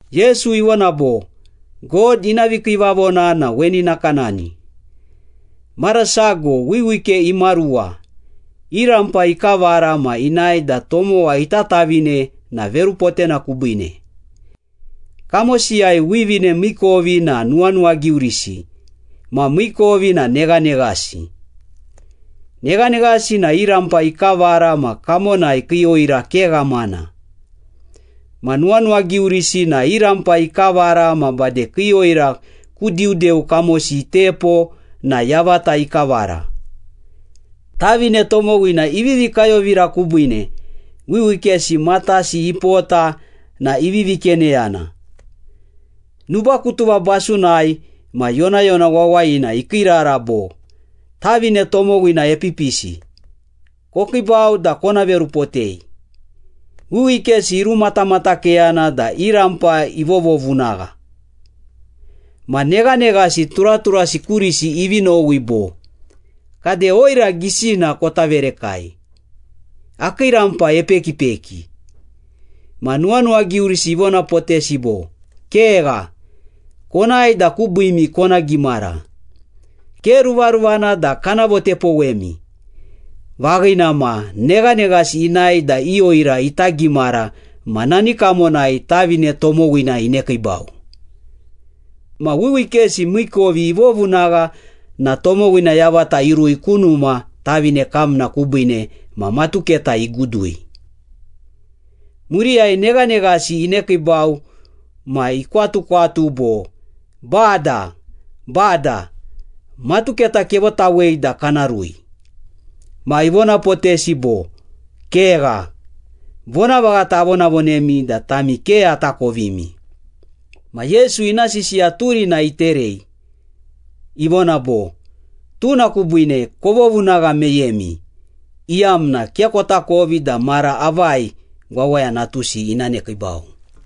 Yesu ivona bo, “God ina vikiivavona na weni nakanani. Mara sago wiwike imaruwa, i rampa ikavara ma inae da tomowa ita tavine na verupotena kubiine. Kamosiyai wivine miikovi na nuwanuwagiurisi ma miikovi na neghaneghasi. Neghaneghasi na i rampa ikavara ma kamonai kii oira ke ghamana. Ma nuwanuwagiurisi na i rampa ikavara ma bade kii oira ku diudeu kamosi itepo na yavata ikavara. Tavine tomowina ivivi kayovira kubiine, wiwikesi matasi ipota na ivivi keneyana.” “Nubakutuva basunai ma yonayona wawayina ikiirara bo, ‘Tavine tomowina epipisi! Kokiibau da kona verupotei!’ Wiwikesi irumatamatakeyana da i rampa ivovovunagha. Ma neghaneghasi turaturasi kurisi ivi nowi bo, ‘Kade oira gisina kota verekai, akii rampa epekipeki.’ Ma nuwanuwagiurisi ivonapotesi bo, ‘Kegha. Konae da kubiimi kona gimara. Ke ruvaruvana da kana votepowemi.’ Vaghina ma, neghaneghasi inae da i oira ita gimara ma nani kamonai tavine tomowina inekiibau. Ma wiwikesi miikovi ivovunagha na tomowina yavata irui ku numa tavine kamna kubiine ma matuketa igudui.” “Muriyai neghaneghasi inekiibau ma ikwatukwatu bo, ‘Bada, Bada! Matuketa kevotawei da kana rui!’ Ma ivonapotesi bo, ‘Kegha! Vonavaghata avonavonemi da tami ke atakovimi!’” Ma Yesu ina sisiya turina iterei, ivona bo, “Tuna kubiine kovovunagha meyemi, iyamna ke kotakovi da mara avai Wawaya Natusi ina nekiibau.”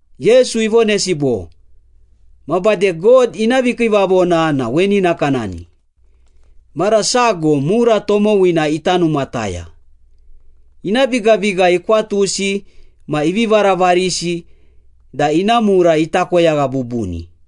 Yesu ivonesi bo, “Ma bade God ina vikiivavona na weni nakanani. Mara sago mura tomowina ita numataya. Ina bigabiga ikwatusi ma ivi varavarisi da ina mura ita koyagha bubuni.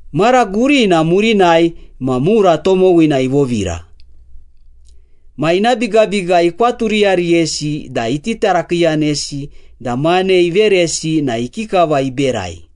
“Mara gurina murinai ma mura tomowina ivovira. Ma ina bigabiga ikwaturiyariyesi da iti tarakiiyanesi da mane iveresi na ikikava iberai.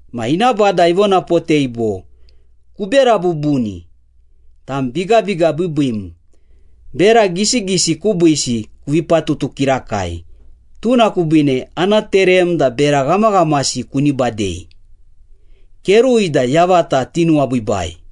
Ma ina bada ivonapotei bo, ‘Kubera bubuni, tam bigabiga biibiim! Bera gisigisi kubiisi kuvi patutu kirakai, tuna kubiine ana terem da bera ghamaghamasi kuni badei. Kerui da yavata tinuwabiibai.’”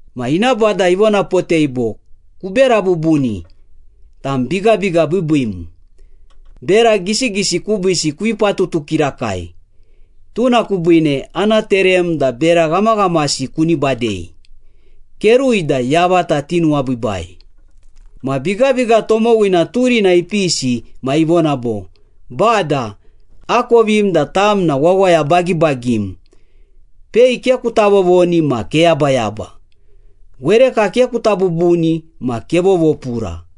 Ma ina bada ivonapotei bo, ‘Kubera bubuni, tam bigabiga biibiim! Bera gisigisi kubiisi kuvi patutu kirakai, tuna kubiine ana terem da bera ghamaghamasi kuni badei. Kerui da yavata tinuwabiibai.’” “Ma bigabiga tomowina turina ipisi ma ivona bo, ‘Bada, akovim da tam na wawaya bagibagim. Pei ke kuta vovoni ma keyabayaba. Wereka ke kuta bubuni ma kevovopura.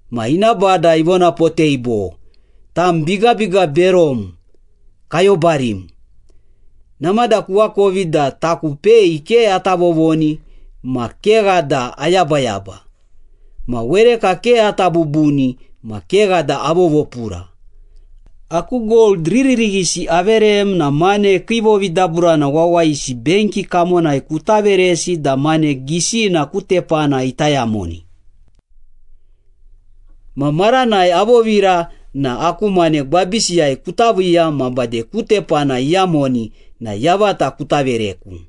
Ma ina bada ivonapotei bo, ‘Tam bigabiga berom, kayobarim! Namada kuakovi da taku pei ke ata vovoni ma kegha da ayabayaba, ma wereka ke ata bubuni ma kegha da avovopura. Aku gold riririghisi averem na mane kii vovidaburana wawayisi benki kamonai kuta veresi da mane gisina ku tepana ita yamoni. Ma maranai avovira na aku mane gwabisiyai kuta viiya ma bade ku tepana iyamoni na yavata kuta vereku.’”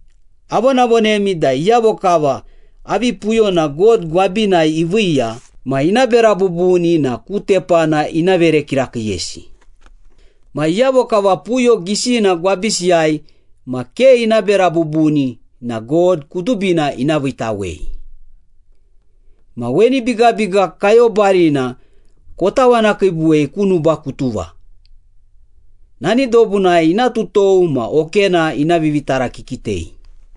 ‘Avonavonemi da iyavo kava avi puyona God gwabinai iviiya ma ina bera bubuni na ku tepana ina vere kirakiiyesi. Ma iyavo kava puyo gisina gwabisiyai ma ke ina bera bubuni na God kudubina ina viitawei. Ma weni bigabiga kayobarina kotawanakiibuwei ku nubakutuva. Nani dobunai ina tutou ma okena ina vivitarakikitei.’”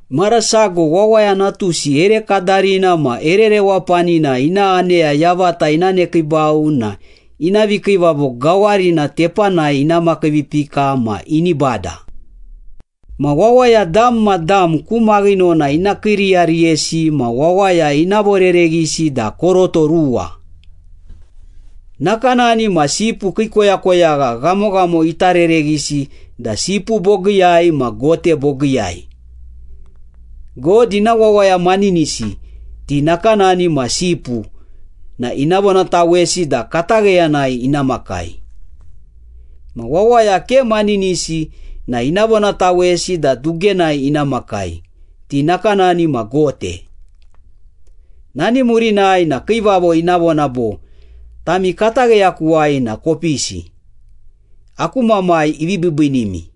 “Mara sago Wawaya Natusi ere kadarina ma ere rewapanina ina aneya yavata ina nekiibau na ina vikiivavo gawarina tepanai ina makiivipika ma ini bada. Ma wawaya dam ma dam ku maghinona ina kiiriyariyesi ma wawaya ina vorereghisi da koroto ruwa. Nakanani ma sipu kii koyakoyagha ghamoghamo ita rereghisi da sipu bogiiyai ma gote bogiiyai. God ina wawaya maninisi, ti nakanani ma sipu na ina vonatawesi da katagheyanai ina makai. Ma wawaya ke maninisi na ina vonatawesi da dugenai ina makai, ti nakanani ma gote. Nani murinai na Kiivavo ina vona bo, ‘Tami katagheyakuwai na kopisi. Aku Mamai ivi biibiinimi.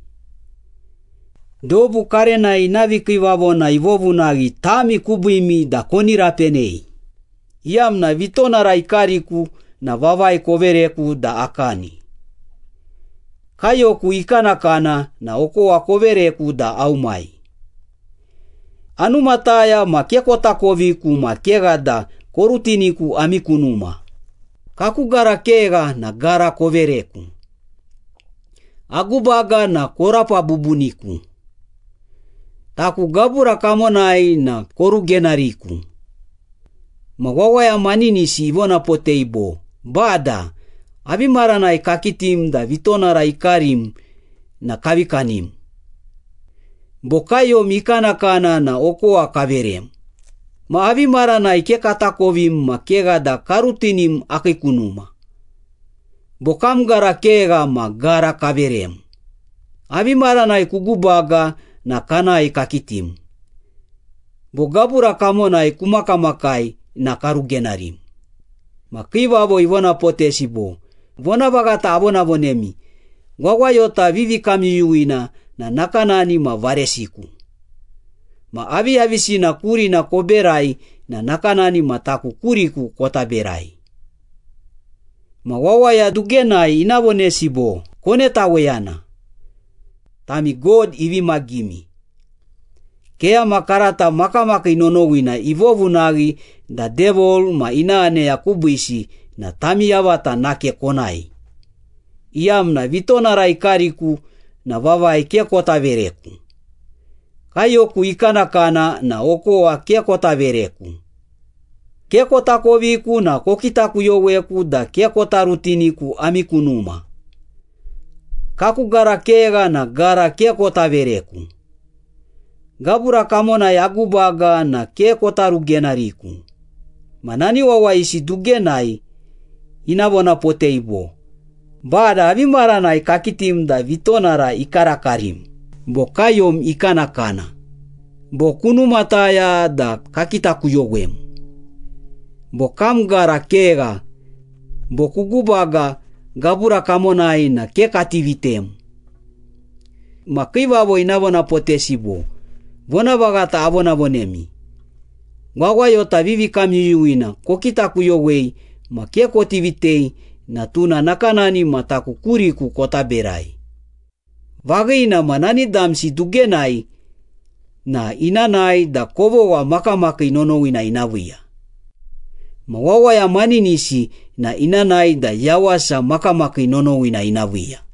Dobu karenai ina vikiivavona ivovunaghi tami kubiimi da koni rapenei, iyamna vitonara ikariku na vavai kovereku da akani. Kaiyoku ikanakana na okowa kovereku da aumai. Anumataya ma ke kotakoviku ma kegha da korutiniku ami ku numa. Kaku gara kegha na gara kovereku. Agubaga na korapa bubuniku. Taku gabura kamonai na korugenariku.’ Ma wawaya maninisi ivonapotei bo, ‘Bada, avi maranai kakitim da vitonara ikarim na kavi kanim? Bo kaiyom ikanakana na okowa kaverem? Ma avi maranai ke katakovim ma kegha da karutinim akii ku numa? Bo kam gara kegha ma gara kaverem? Avi maranai kugubaga na kanae kakitim? Bo gabura kamonai kumakamakai na karugenarim?’ Ma kiivavo ina vonapotesi bo, ‘Vonavaghata avonavonemi, wawayota vivikamyuyuwina na nakanani ma varesiku. Ma aviyavisina kurina koberai na nakanani ma taku kuriku kota berai.’” “Ma wawaya dugenai ina vonesi bo, ‘Konetaweyana! Tami God ivi magimi. Keyama karata makamakii nonowina ivovunaghi da Devil ma ina aneya kubiisi na tami yavata nake konae, iyamna vitonara ikariku na vavai ke kota vereku. Kaiyoku ikanakana na okowa ke kota vereku. Ke kotakoviku na kokitakuyoweku da ke kota rutiniku ami ku numa. Kaku gara kegha na gara ke kota vereku. Gabura kamonai agubaga na ke kota rugenariku.’” “Ma nani wawayisi dugenai ina vonapotei bo, ‘Bada, avi maranai kakitim da vitonara ikarakarim, bo kaiyom ikanakana, bo kunumataya da kakitakuyowem, bo kam gara kegha, bo kugubaga gabura kamonai na ke kati vitem?’ Ma kiivavo ina vonapotesi bo, ‘Vonavaghata avonavonemi, wawayota vivikamyuyuwina kokitakuyowei ma ke koti vitei na tuna nakanani ma taku kuriku kota berai.’ Vaghina ma, nani damsi dugenai na ina nae da kovogha makamakii nonowina ina viiya. Ma wawaya maninisi na ina nae da yawasa makamakii nonowina ina viiya.”